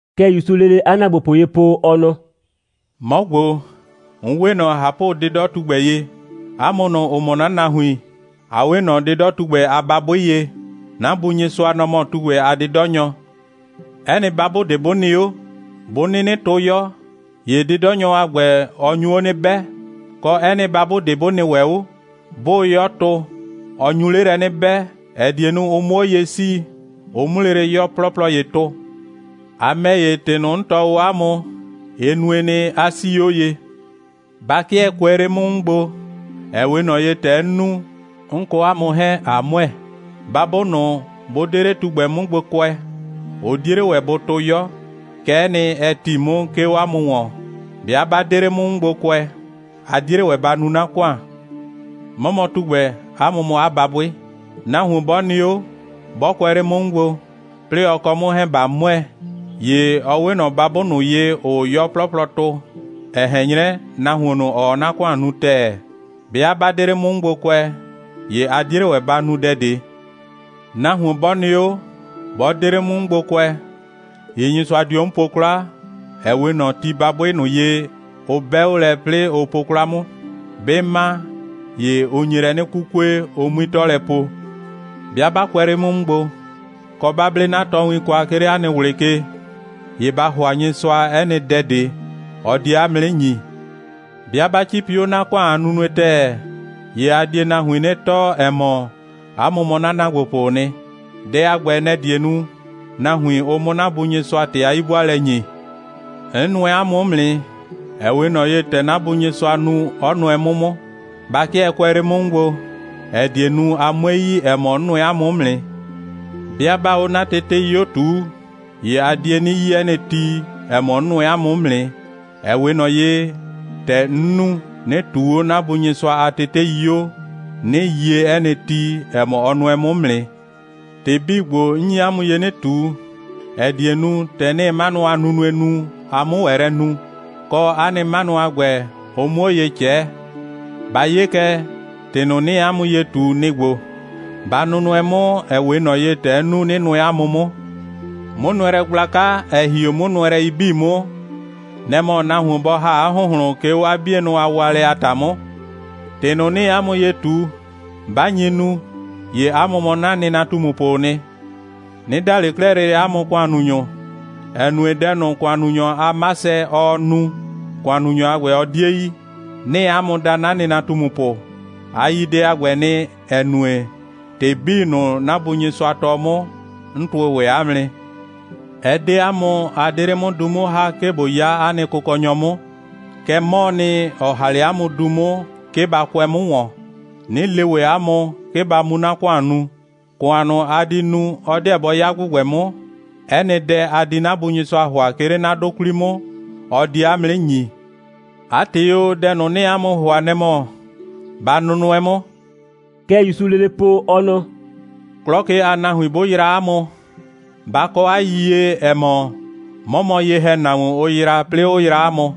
Kɛ ‑Yusuu lele 'a ‑naagbopʋ ye po, ɔ nɔ: «'Mɔ ‑gbo, 'n 'we ꞊nɔ ꞊hapʋ'dɩdɔtugbɛ ye, 'a mʋ ꞊nʋ, ‑ʋ mɔ 'na nahuin, 'a 'we ꞊nɔ 'dɩdɔtugbɛ a babʋɩ ye, 'na Bu Nyɩsʋa, nɔ‑ mɔ tugbɛ a 'dɩdɔnyɔ. 'Ɛ nɩ babʋ ꞊de 'bʋ nɩ 'o, 'bʋ 'nɩnɩ tʋ 'yɔ, ‑ye 'dɩdɔnyɔ a ‑gbɛ, ɔ nyu 'o 'nɩ 'bɛ, kɔ, 'ɛ nɩ babʋ ꞊de 'bʋ nɩ ‑wɛ 'o, 'bʋʋ 'yɔ tʋ, ɔ nyu 'le lɛ 'nɩ 'bɛ, ‑ɛ die nu, ʋ 'mʋ 'o ye 'sii, ʋ 'mʋ lele 'yɔ 'plɔplɔ ‑ye tʋ. A ‑mɛ ‑ye, ‑tɩ ꞊nʋ, 'n tɔɔ 'a mʋ, ɩ nue nɩ, 'a 'sii 'o ye. Ba 'kɩɛ kʋɛɛ 'le 'mʋ 'mʋ gbo, ‑ɛ 'we ꞊nɔ ye, ‑tɛ 'n nu, 'n kɔ 'a mʋ 'hɛɛn, ꞊a ‑mʋɛ. Babʋ ꞊nʋ, 'bʋ 'de 'le tugbɛ 'mʋ gbo kʋɛ, ʋ 'die 'le ‑wɛ bʋ tʋ 'yɔ. Kɛ'ɛ nɩ, ɛ ‑ti 'mʋ, 'ke 'o 'a mʋ ‑wɔn. 'Bɩa 'ba 'de 'le 'mʋ 'mʋ gbo kʋɛ, a 'die 'le ‑wɛ ba nu 'na ‑kʋan. 'Mɔ mɔ tugbɛ, 'a mʋ mɔ 'a babʋɩ. Nahuon 'bɔ nɩ 'o, 'bɔ kʋɛ 'le 'mʋ 'mʋ gbo, 'plɩɩ ɔ kɔ 'mʋ 'hɛɛn, ꞊ba ‑mʋɛ, ‑ye ɔ 'we ꞊nɔ babʋ ꞊nʋ ye, ‑ʋʋ 'yɔ 'plɔplɔ tʋ, ‑ɛ ꞊hɛn 'nyrɛ, nahuon ꞊nʋ, ‑ɔɔ 'na ‑kʋan nu ‑tɛɛ. 'Bɩa 'ba 'de 'le 'mʋ 'mʋ gbo kʋɛ, ‑ye a 'die 'le ‑wɛ ba nu dɛ ꞊de. Nahuon 'bɔ nɩ 'o, 'bɔ 'de 'le 'mʋ 'mʋ gbo kʋɛ, ‑ye Nyɩsʋa dio 'mʋ po 'kwla, ‑ɛ 'we ꞊nɔ tibabʋɩ ꞊nʋ ye, ʋ 'bɛ 'o lɛ, 'plɩɩ ʋ po 'kwla 'mʋ. 'Bɩ ma, ‑ye ʋ nye lɛ 'nɩ 'kukue, ʋ 'mui 'tɔ lɛ po. 'Bɩa 'ba kʋɛ 'le 'mʋ 'mʋ gbo, kɔ, 'ba 'ble 'na tɔɔwin kwa, 'ke 'le 'a nɩ ꞊wlɩ ke, ‑ye ba ‑hʋa Nyɩsʋa 'ɛ nɩ dɛ ꞊de, ɔ die 'a mʋ 'nɩ ‑nyi. 'Bɩa 'ba 'cipi 'o 'na ‑kʋan a nunue ‑tɛɛ, ‑ye a die nahuin 'nɩ tɔɔ, ‑ɛ mɔ, 'a mʋ mɔ 'na ‑naagbopʋʋ nɩ. Dɛ a ‑gbɛ, nɛ‑ die nu, nahuin, ʋ 'mʋ 'na Bu Nyɩsʋa ‑tɩ a 'yi'bʋaalɛ ‑nyi. 'N nʋɛ 'a mʋ 'mʋ nɩ, ‑ɛ 'we ꞊nɔ ye, ‑tɛ 'na Bu Nyɩsʋa nu, 'ɔ nʋɛ 'mʋ 'mʋ. Ba 'kɩɛ kʋɛɛ 'le 'mʋ 'mʋ gbo, ‑ɛ die nu, a 'mue yi, ‑ɛ mɔ, 'n nʋɛ 'a mʋ 'mʋ nɩ. 'Bɩa 'baa 'o 'na tetei 'o ꞊tuu, ‑ye a die 'nɩ yi 'ɛ nɩ ti, ‑ɛ mɔ, 'n nʋɛ 'a mʋ 'mʋ nɩ, ‑ɛ 'we ꞊nɔ ye, ‑tɛ 'n nu, 'nɩ ꞊tuu 'o 'na Bu Nyɩsʋa a tetei 'o, 'nɩ yie 'ɛ nɩ ti, ‑ɛ mɔ, ɔ nʋɛ 'mʋ 'mʋ nɩ. ‑Tɩ 'bii ‑gbo, 'n nyi 'a mʋ ye 'nɩ ꞊tu, ‑ɛ die nu, ‑tɛ 'nɩɩ 'manʋ a nunue nu, a 'mʋ ‑wɛ lɛ nu, kɔ, 'a nɩ 'manʋ a ‑gbɛ, ʋ 'mʋ 'o ye ꞊cɛɛ. Ba 'ye kɛ, ‑tɩ ꞊nʋ, 'nɩɩ 'a mʋ ye ꞊tu, nɩ‑ ‑gbo: Ba nʋnʋɛ 'mʋ, ‑ɛ 'we ꞊nɔ ye, ‑tɛ 'n nu, 'nɩ nʋɛ 'a mʋ 'mʋ. 'Mʋnʋɛlɛ gblaka, ‑ɛ ‑hi 'o 'mʋnʋɛlɛi 'bii 'mʋ, nɛ‑ mɔ, nahuon 'bɔ ‑ha 'a ‑hʋnhlʋn, 'ke 'o 'a 'bienʋ a waalɛ a ‑ta 'mʋ. ‑Tɩ ꞊nʋ, 'nɩɩ 'a mʋ ye ꞊tu, 'ba nyi nu, ‑ye 'a mʋ mɔ 'na nɩnatumupʋʋ nɩ. 'Nɩ daa ꞊le 'klɛɛ lele 'a mʋ ‑kʋannunyʋ, ‑ɛ nue, dɛ ꞊nʋ, ‑kʋannunyɔ a 'masɛ, ɔɔ nu, ‑kʋannunyɔ a ‑gbɛ, ɔ 'die yi. 'Nɩɩ 'a mʋ daa 'na nɩnatumupʋ. A yi dɛ a ‑gbɛ nɩ, ‑ɛ nue, ‑tɩ 'bii ꞊nʋ, 'na Bu Nyɩsʋa tɔɔ 'mʋ, 'n tʋɩ ‑wɛ 'a mʋ nɩ. Ɛ 'de 'a mʋ, a 'de 'le 'mʋ du 'mʋ ‑ha, 'ke ꞊bo 'ya 'a nɩ Kʋkɔnyɔ 'mʋ. Kɛɛ, 'mɔɔ nɩ, ‑ɔ ‑ha 'le 'a mʋ du 'mʋ, 'ke ba kʋɛ 'mʋ ‑wɔn, 'nɩ le ‑wɛ 'a mʋ, 'ke ba mu 'na ‑kʋan nu. ‑Kʋan ꞊nʋ, a di nu, ɔ 'deɛ bɔ 'ya ‑gbʋgbɛ 'mʋ. 'Ɛ nɩ dɛ, a di 'na Bu Nyɩsʋa ‑hʋa, 'ke 'le 'na 'dʋ 'kwli 'mʋ, ɔ die 'a mʋ 'nɩ ‑nyi. 'A ‑tɩ o, dɛ ꞊nʋ, 'nɩɩ 'a mʋ ‑hʋa, nɛ‑ mɔ: Ba nʋnʋɛ 'mʋ!» Kɛ ‑Yusuu lele po, ɔ nɔ: «'Klɔ ke a nahuin 'bʋ yraa 'a mʋ, ba kɔ 'a yiyie, ‑ɛ mɔ, 'mɔ mɔ ye‑hɛnahuon, ʋ yraa, 'plɩɩ 'ʋ yraa 'a mʋ.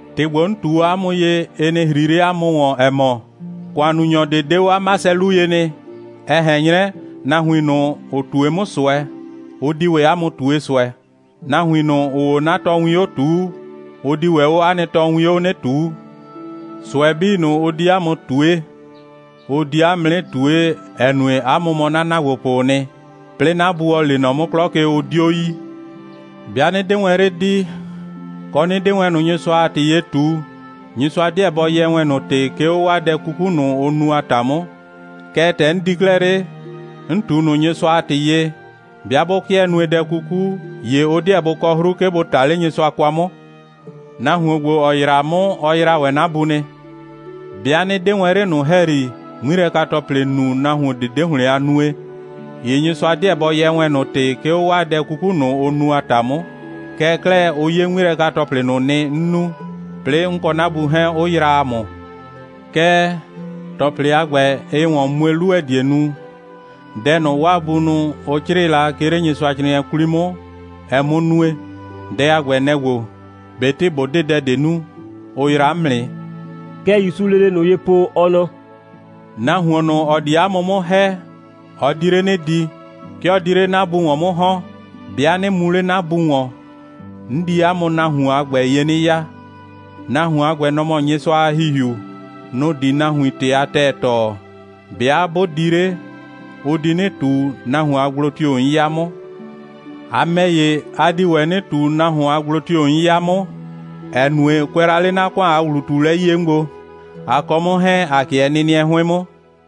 ‑Tɩ ‑gbo, 'n ꞊tu o 'a mʋ ye, ɩ nɩ ‑hri 'le 'a mʋ ‑wɔn, ‑ɛ mɔ: ‑Kʋannunyɔ ꞊de 'de 'o 'a 'masɛ 'lu ye nɩ. Ɛ ꞊hɛn 'nyrɛ, nahuin ꞊nʋ, ‑ʋ ꞊tue 'mʋ ꞊sʋɛ, ʋ di ‑wɛ 'a mʋ ꞊tue ꞊sʋɛ. Nahuin ꞊nʋ, ‑ʋʋ 'o 'na tɔɔwin 'o ꞊tuu, ʋ di ‑wɛ 'o 'a nɩ tɔɔwin 'o 'nɩ ꞊tuu. ꞊Sʋɛ 'bii ꞊nʋ, ʋ di 'a mʋ ꞊tue, ʋ die 'a mʋ 'nɩ ꞊tue, ‑ɛ nue, 'a mʋ mɔ 'na ‑naagbopʋʋ nɩ, 'plɩɩ 'na Bu, ‑ɔ lee nɔ 'mʋ 'klɔ ke, ʋ 'dio yi. 'Bɩa 'nɩ 'de wɛn 'le di, kɔ, 'nɩ 'de wɛn ꞊nʋ Nyɩsʋa a ‑tɩ ye ꞊tu, Nyɩsʋa 'deɛ bɔ yɛɛ wɛn ꞊nʋ ‑tɩ, 'ke 'o 'waa dɛ 'kuku ꞊nʋ, ʋ nu a ‑ta 'mʋ. Kɛɛ, ‑tɛ 'n di 'klɛɛ 'le, 'n ꞊tu ꞊nʋ Nyɩsʋa a ‑tɩ ye, 'bɩa 'bʋ 'kɩɛ nue dɛ 'kuku, ‑ye ʋ 'deɛ bʋ kɔ 'hru, 'ke bʋ ꞊ta 'le Nyɩsʋa kwa 'mʋ. Nahuon ‑gbo, ‑ɔ yraa 'mʋ, ɔ yraa ‑wɛ 'na Bu nɩ. 'Bɩa 'nɩ 'de wɛn 'le ꞊nʋ ‑hɛyri 'ŋmilɛka‑tɔplɩ nuu, nahuon ꞊de 'de ‑hlɩn a nue, ‑ye Nyɩsʋa 'deɛ bɔ yɛɛ wɛn ꞊nʋ ‑tɩ, 'ke 'o 'waa dɛ 'kuku ꞊nʋ, ʋ nu a ‑ta 'mʋ. Kɛɛ 'klɛɛ, ʋ 'ye 'ŋmilɛka‑tɔplɩ ꞊nʋ nɩ, 'n nu, 'plɩɩ 'n kɔ 'na Bu 'hɛɛn, 'ʋ yraa ‑a mʋ. Kɛɛ, ‑tɔplɩ a ‑gbɛ, ɩɩ ‑wɔn mue 'lu, ‑ɛ die nu, dɛ ꞊nʋ, 'waa bunʋ, ʋ 'crɩɩ la, 'ke 'le Nyɩsʋacrɩɩnɩɛ 'kwli 'mʋ, ɛ 'mʋ nue. Dɛ a ‑gbɛ, nɛ‑ ‑gbo: ꞊Betɩ ꞊bo 'de dɛ ꞊de nu, ʋ yraa 'mʋ nɩ.» Kɛ ‑Yusuu lele ꞊nʋ ye po, ɔ nɔ: «Nahuon ꞊nʋ, ‑ɔ di 'a mʋ 'mʋ ‑hɛ, ɔ di 'le 'nɩ di. 'Ke ɔ di 'le 'na Bu ‑wɔn 'mʋ ‑hɔn. 'Bɩa 'nɩ mu 'le 'na Bu ‑wɔn, 'n di 'a mʋ nahuon a ‑gbɛ ye 'nɩ ya. Nahuon a ‑gbɛ, nɔ‑ mɔ Nyɩsʋa a ‑Hihiu. Nʋ‑ di nahuin ‑tɩ a ‑tɛɛ tɔɔ. 'Bɩa 'bʋ di 'le, ʋ di 'nɩ ꞊tu, nahuon a gblo tio‑ 'n 'ya 'mʋ. A ‑mɛ ‑ye, a di ‑wɛ 'nɩ ꞊tu, nahuon a gblo tio‑ 'n 'ya 'mʋ, ‑ɛ nue, kʋɛ la 'le 'na ‑kʋan a ‑wlu꞊tuulɛ 'yie 'mʋ gbo, a kɔ 'mʋ 'hɛɛn, ‑a 'kɩɛ nɩnɩɛ 'hʋɩn 'mʋ.